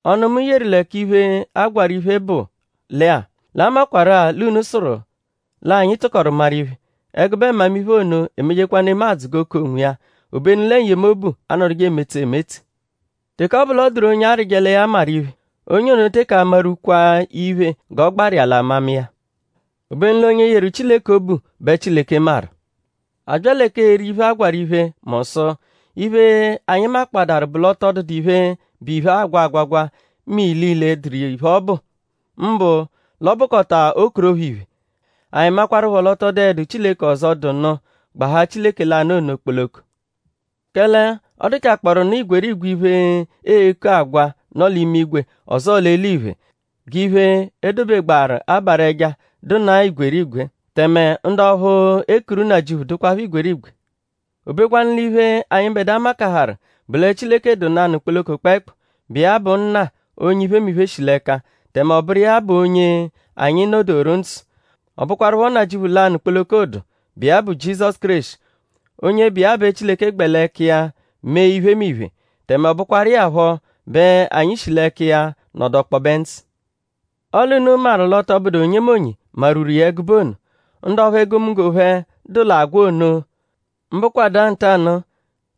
Ọnu, mu yeru lẹ k'iphe, a gwarụ iphe bụ lẹ-a; l'a makwarụ-a l'unu sụru l'anyi tụkoru maru iphe. Ẹgube mmamiphe ono emejekwa nemadzụ g'o ku onwiya; obenu lẹ n-yemobu anọduje emetse emetse. Teke ọ bụ l'ọ dụru onye arịje lẹ ya maru iphe; onye ono teke amarwukwa iphe g'ọ gbaru iya l'amama iya. Obenu l'onye yeru Chileke obu bẹ Chileke maru. A bya lẹ k'eri iphe, a gwarụ iphe mu sụ; iphe, anyi makpọadaru bụ l'ọ tọ dụdu iphe, bụ iphe, aagwa agwagwa mẹ ilile dụru iphe, ọ bụ; mbụ l'ọ bụkota okorophoo iphe. Anyi makwaruphọ l'ọ tọ dụedu Chileke ọzo, dụ nụ gbahaa Chileke lanụ ono kpoloko. Kẹle ọ dụchakpooru nụ igwerigwe iphe, eeku agwa, nọ l'imigwe ọzoo l'eliphe; g'iphe, e dobegbaaru abarụ ẹja dụnaa igwerigwe; tẹme ndu ọphu ekuru nnajịuphu dụkwapho igwerigwe; obekwanu l'iphe, anyịbedua makaharụ bụ lẹ Chileke dụ nanụ kpoloko kpẹekpu, bụ iya bụ Nna, onye iphemiphe shi l'ẹka; tẹme ọ bụru iya bụ onye anyi nọ-doru ndzụ. Ọ bụkwarupho Nnajịuphu lanụ kpoloko dụ, bụ iya bụ Jizọsu Kéreshi; onye bụ iya bẹ Chileke gbẹ l'ẹka iya mee iphemiphe; tẹme ọ bụkwaru iya phọ bẹ anyi shi l'ẹka iya nọdu ọkpobe ndzụ. Ọle unu maru l'ọ tọ bụdu onyemonye marwuru iya ẹgube ono. Ndu ọphu egomunggo phẹ dụ l'agwa ono mbụkwadua ntanụ-a;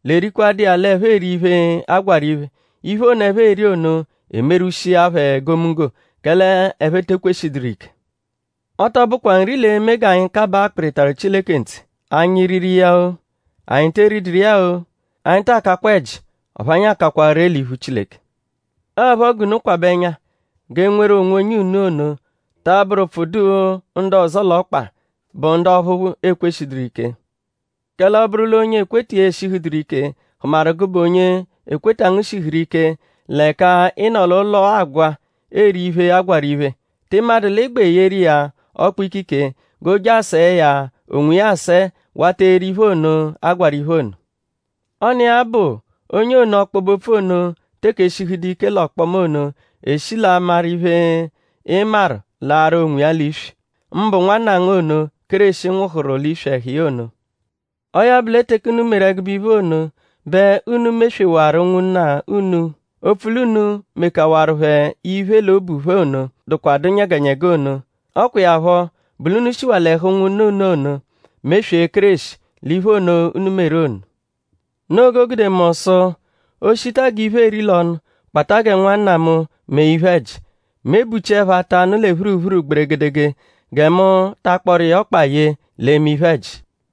l'erikwadụ iya l'ẹphe eri iphe, agwarụ iphe. Iphe ono, ẹphe eri ono emerwushia phẹ egomunggo; kẹle ẹphe te ekweshidụru ike. Ọ tọ bụkwa nri l'e-me g'anyi kabaa akpịritaru Chileke ntse.?Anyi riru iya-o;?anyi te eriduru iya-o; anyi taa kakwa ẹji; ọphu anyi a-kakwa ree l'iphu Chileke. Ọo phọ g'unu kwabẹ ẹnya g'enweru onwonye unu ono ta abụru ụpfu dụ ndu ọzo l'ọkpa, bụ ndu ọphu ekweshidụru ike. Kẹle ọ -bụru l'onye ekweta iya eshihụduru ike hụmaru gụbe onye ekweta ngu shihụru ike l'ẹka ị nọ l'ụlo agwa eri iphe, agwarụ iphe;?tị madụ l'ị gbẹ eyeru iya ọkpu-ikike g'o je asẹe ya onwiya asẹe wata eri iphe ono, a gwarụ iphe ono? Ọ n'iya bụ onye ono, ọkpobe-opfu ono teke eshihudu ike l'ọkpoma ono eshi l'amarụ iphe, ị maru laaru onwiya l'iswi; mbụ nwanna ngu ono, Kéreshi nwụhuru l'iswi ẹhu iya ono. Ọo ya bụ lẹ teke unu meru ẹgube ono bẹ unu meswewaru ụnwunna unu; opfu l'unu mekawarụ phẹ iphe l'obu phẹ ono, dụkwadu nyẹgenyege ono. Ọ kwa iya phọ bụ l'unu shiwaa l'ẹhu ụnwunna unu ono meswee Kéreshi l'iphe ono, unu meru ono. Noo g'o gude mu sụ: o -shita g'iphe eri l'ọnu kpata gẹ nwanna mu mee iphe-ẹji; mu ebuchiẹpho ata anụ lẹ phuruphuru gberegedege gẹ mu ta akpọru iya ọkpa ye l'eme iphe-ẹji.